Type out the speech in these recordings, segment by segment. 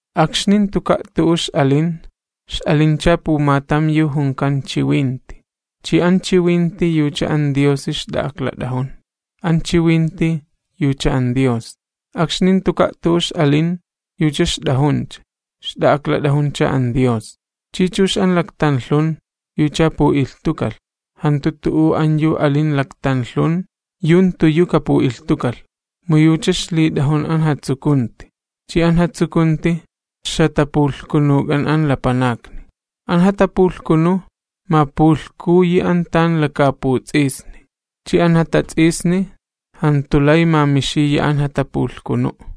Akxni jantuka' tu'u ix'alin, ix'alincha pumatam yu junkan Chiwinti, chi an Chiwinti yucha an Diosi ixt'a'aklat'ajun, an Chiwinti yucha an Dios. Akxni jantuka' tu'u ix'alin, yucha ixt'ajuncha, ixt'a'aklat'ajuncha an Dios. Chi chux an laktanlhun, yucha pu'ilhtukalh, jantu tu'u an yu alin laktanlhun yu jantu yu kapu'ilhtukalh. Mu yucha ixlit'ajun an jatsukunti, chi an jatsukunti, ixjatapulhkunuk'an an lapanakni. An jatapulhkunu mapulhkuyi an tan lakaaputs'isni, chi an jatats'isni jantu lay mamixiya an jatapulhkunu'.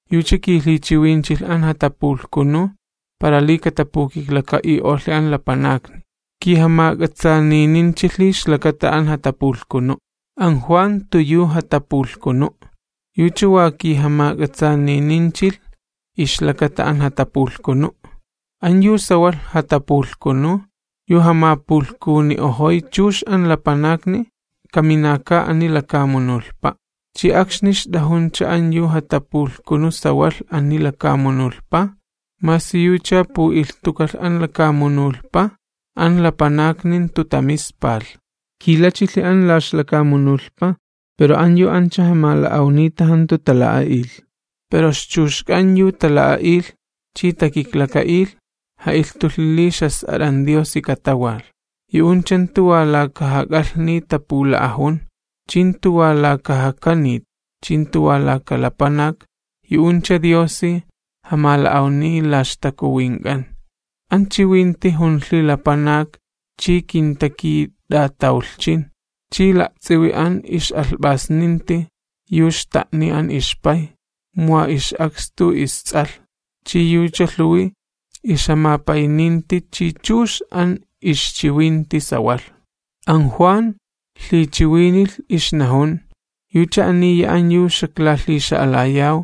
Yucha kilhichiwinchilh an jatapulhkunu', para li katapukiklaka'i'olhi an lapanakni, kijamak'ats'aanininchilhi ixlakata an jatapulhkunu'. An Juan jantu yu jatapulhkunu', yucha wa kijamak'atsaanininchilh ixlakata an jatapulhkunu'. An yu sawalh jatapulhkunu yu jamapulhkuni'ojoy chux an lapanakni kaminaka ani lakamunulhpa'. Chi akxni ixt'ajuncha an yu jatapulhkunu sawalh ani lakamunulhpa, masi yucha pu'ilhtukalh an lakamunulhpa, an lapanakni jantu tamispalh. Kilachilhi an la ixlakamunulhpa pero an yu ancha jamala'awnita jantu tala'a'ilh. Pero ixchuxk'an yu tala'a'ilh, chi takiklaka'ilh, ja'ilhtulhi li ixjas'at'an Diosi katawalh. Yu'uncha jantu wa laka jak'alhni tapula'ajun, chi jantu wa laka jakanit, chi jantu wa laka lapanak, yu'uncha Diosi jamala'awniy la ixtakuwink'an. An Chiwinti junlhi lapanak chi kintakit'atawlhchin. Chi la'ts'iwi an ix'alhp'asninti, yu xta'niy an ixPay, mu wa ix'akstu isTs'alh, chi yucha lhuwi ixjamapayninti chi chux an ixchiwinti sawalh. An Juan lhichiwinilh ixnajun: ―Yucha aniya an yu xaklalhixa'alayaw,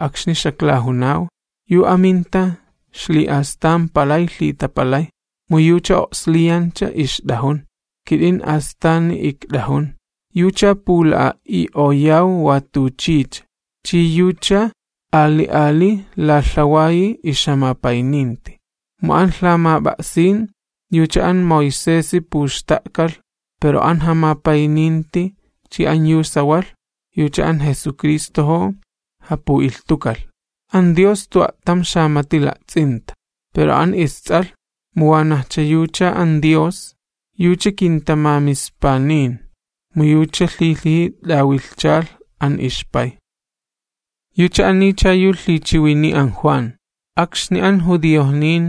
akxni xaklajunaw: “Yu aminta ixli'astan palay lhitapalay, mu yucha o'sliyancha ixt'ajun, kit'in astani ikt'ajun.” Yucha pula'a'i'oyaw wa tuchicha, chi yucha ali ali lalhawayi ixjamapayninti. Mu an lhamap'a'sin yucha an Moisesi puxta'kalh, pero an jamapayninti chi an yu sawalh yucha an Jesucristojo japu'ilhtukalh. An Dios jantu a'tam xamati la'ts'inta; pero an isTs'alh, mu wanajcha yucha an Dios, yucha kintamamispanin, mu yucha lhilhiji t'awilhchalh an ixPay. Yucha anicha yu lhichiwiniy an Juan, akxni an judiojnin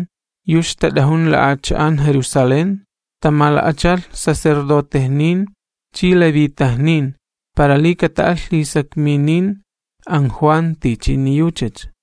yu ixtat'ajun la'acha'an Jerusalén, tamala'achalh sacerdotejnin chi levitajnin para li kata'alh lhisakminin an Juan tichini yuchacha.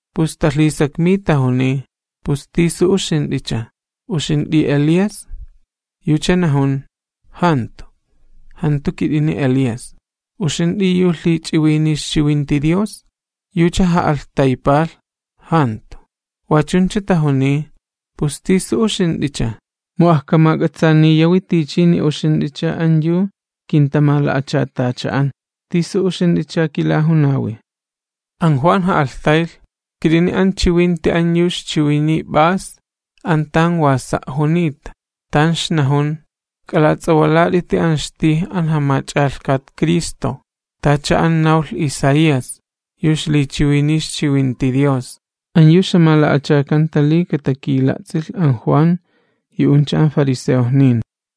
Pus talhisakmiy tajuniy: ―¿Pus tisu uxint'icha? ¿Uxint'i Elías? Yucha najun: ―Jantu, jantu kit'ini Elías. ―¿Uxint'i yu lhich'iwiniy ixchiwinti Dios? Yucha ja'alhtaypalh: ―Jantu. Wa chuncha, tajuniy: ―¿Pus tisu uxint'icha? Mu ajkamak'atsaaniyawi tichini uxint'icha an yu kintamala'achatacha'an. ¿Tisu uxint'icha kilajunawi? An Juan ja'alhtaylh: ―Kit'ini an chiwinti an yu ixchiwiniy p'as an tan wa sa' junita, tan ixnajun: “K'alats'awalat'iti an ixtij an Jamach'alhkat Cristo.” Tacha an nawlh Isaías, yu ixlichiwiniy ixchiwinti Dios. An yu ixjamala'achakanta li katakila'ts'ilh an Juan yu'uncha an fariseojnin.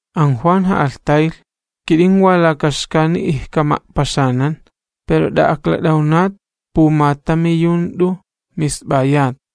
An Juan ja'alhtaylh: ―Kit'in wa laka xkani ijkama'paxanan, pero t'a'aklat'awnat pumatami yu jant'u misp'ayat.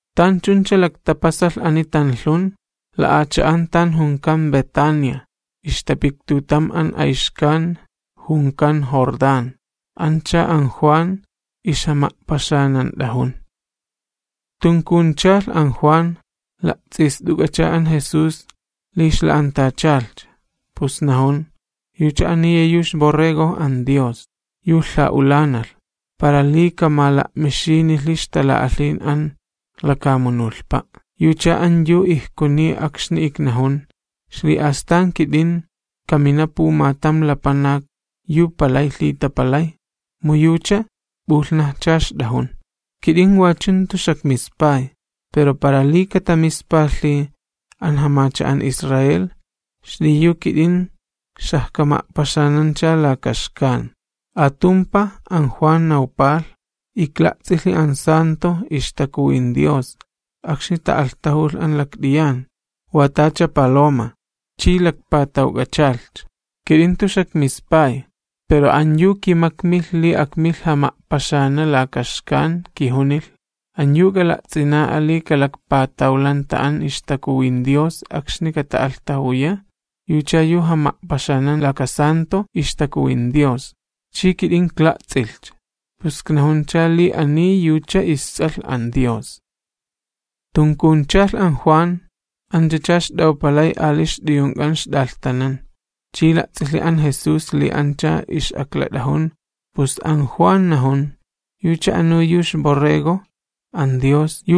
Tan chuncha laktapasalh ani tanlhun, la'acha'an tan junkan Betania, ixtapiktutam an ayxkan junkan Jordán, ancha an Juan ixjama'paxanant'ajun. Tunkunchalh an Juan, la'ts'ist'uk'acha an Jesús li ixla'antachalhcha, pus najun: ―¡Yucha aniya yu ixJas'at'a Borrego an Dios, yu lha'ulanalh, para li kamala'mixinilhi ixtala'alhin an lakamunulhpa'! Yucha an yu ijkuniy akxni iknajun: “Ixli'astan kit'in, kamina pumatam lapanak yu palay lhitapalay, mu yucha p'ulhnajcha ixt'ajun.” Kit'in wachu jantu xakmispay, pero para li katamispalhi an jamacha'an Israel, xliyu kit'in xajkama'paxanancha lakaxkan. Atumpaj an Juan nawpalh: ―Ikla'ts'ilhi an ixTakuwin Dios akxni ta'alhtajulh an lakt'iyan, wa tacha paloma, tan ixyalh. Kit'in jantu xakmispay, pero an yu kimakmilh li akmilh jama'paxana lakaxkan kijunilh: “An yu k'ala'ts'ina'a li kalakpatawlanta an ixTakuwin Dios akxni kata'alhtajuya, yucha yu jama'paxanan laka Stalan'a ixTakuwin Dios.” Chi kit'in ikla'ts'ilhcha, pus iknajuncha li ani yucha isTs'alh an Dios. Tunkunchalh an Juan anchacha ixt'awpalay ali ixt'uyunk'an ixt'alhtanan. Chi la'ts'ilhi an Jesús li ancha ix'aklat'ajun, pus an Juan najun: ―¡Yucha anu yu ixJas'at'a Borrego an Dios!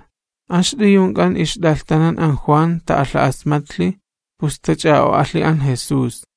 An ixt'uyunk'an ixt'alhtanan an Juan ta'alha'asmatlhi, pus tach'a'o'alhi an Jesús.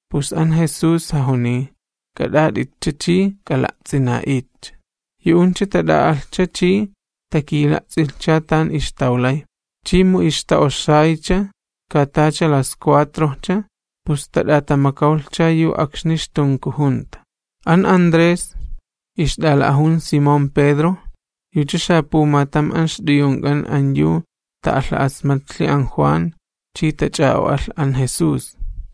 Pus an Jesús jajuniy: ―K'at'at'itcha ch'i k'ala'ts'ina'itcha. Yu'uncha tat'a'alhcha chi takila'ts'ilhcha tan ixtawlay, chi mu ixta'oxaycha ka tacha las cuatrojcha, pus tat'atamakawchalhcha yu akxni ixtunkujunta. An Andrés, ixt'ala'ajun Simón Pedro, yucha xapumatam an ixt'uyunk'an an yu ta'alha'asmatlhi an Juan chi tach'a'o'alh an Jesús.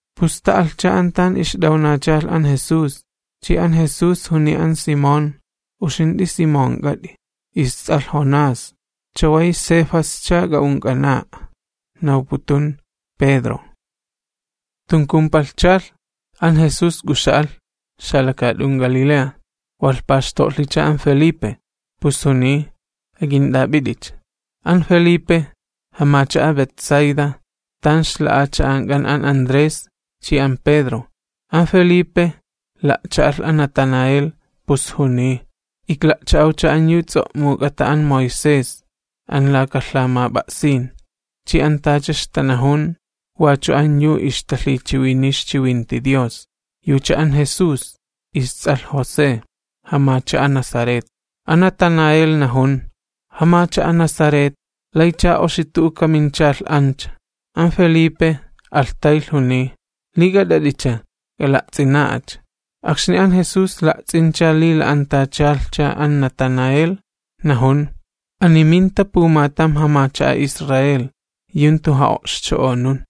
Pus t'a'alhcha an tan ixt'awnachalh an Jesús, chi an Jesús juniy an Simón: ―Uxint'i Simonk'at'i, ists'alh Jonás, chaway Cefasch'a k'a'unk'ana'a ―nawputun Pedro. Tunkumpalhchalh, an Jesús k'uxa'alh xalakaat'un Galilea, walh paxto'lhicha an Felipe, pus juniy: ―Ak'int'ap'it'icha. An Felipe, jamacha'a Betsaida, tan ixla'acha'ank'an an Andrés chi an Pedro. An Felipe la'cha'alh an Natanael, pus juniy: ―Ikla'cha'awcha an yu ts'o'muk'ata an Moisés an laka lhamap'a'sin, chi an tacha ixtanajun wachu an yu ixtalhichiwiniy ixchiwinti Dios: Yucha an Jesús, ists'alh José, jamacha'a Nazaret. An Natanael najun: ―¿Jamacha'a Nazaret, laycha oxi tu'u kaminchalh ancha? An Felipe alhtaylh juniy: ―Li k'at'at'icha k'ala'ts'ina'acha. Akxni an Jesús la'ts'incha li la'antachalhcha an Natanael, najun: ―¡Ani minta pumatam jamacha'a Israel, yu jantu ja'o'xcho'onun!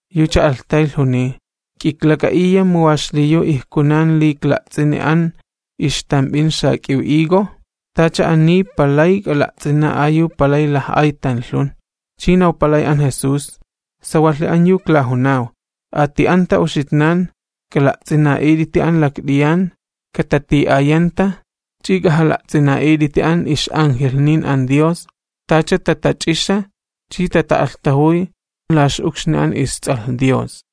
Yucha alhtaylh juniy: ―¿K'iklak'a'iya mu wa xliyu ijkunan li ikla'ts'ini an ixtamp'in xak'iw higo? Tacha ani palay k'ala'ts'ina'a yu palay laj'ay tanlhun. Chi nawpalay an Jesús: ―Sawalhi an yu iklajunaw, ati'anta uxitnan k'ala'ts'ina'it'iti an lakt'iyan katati'ayanta ch'i k'ajala'ts'ina'it'iti an ix'angelhnin an Dios tacha tatach'ixa chi tata'alhtajuy la ix'ukxni an isTs'alh Lapanak.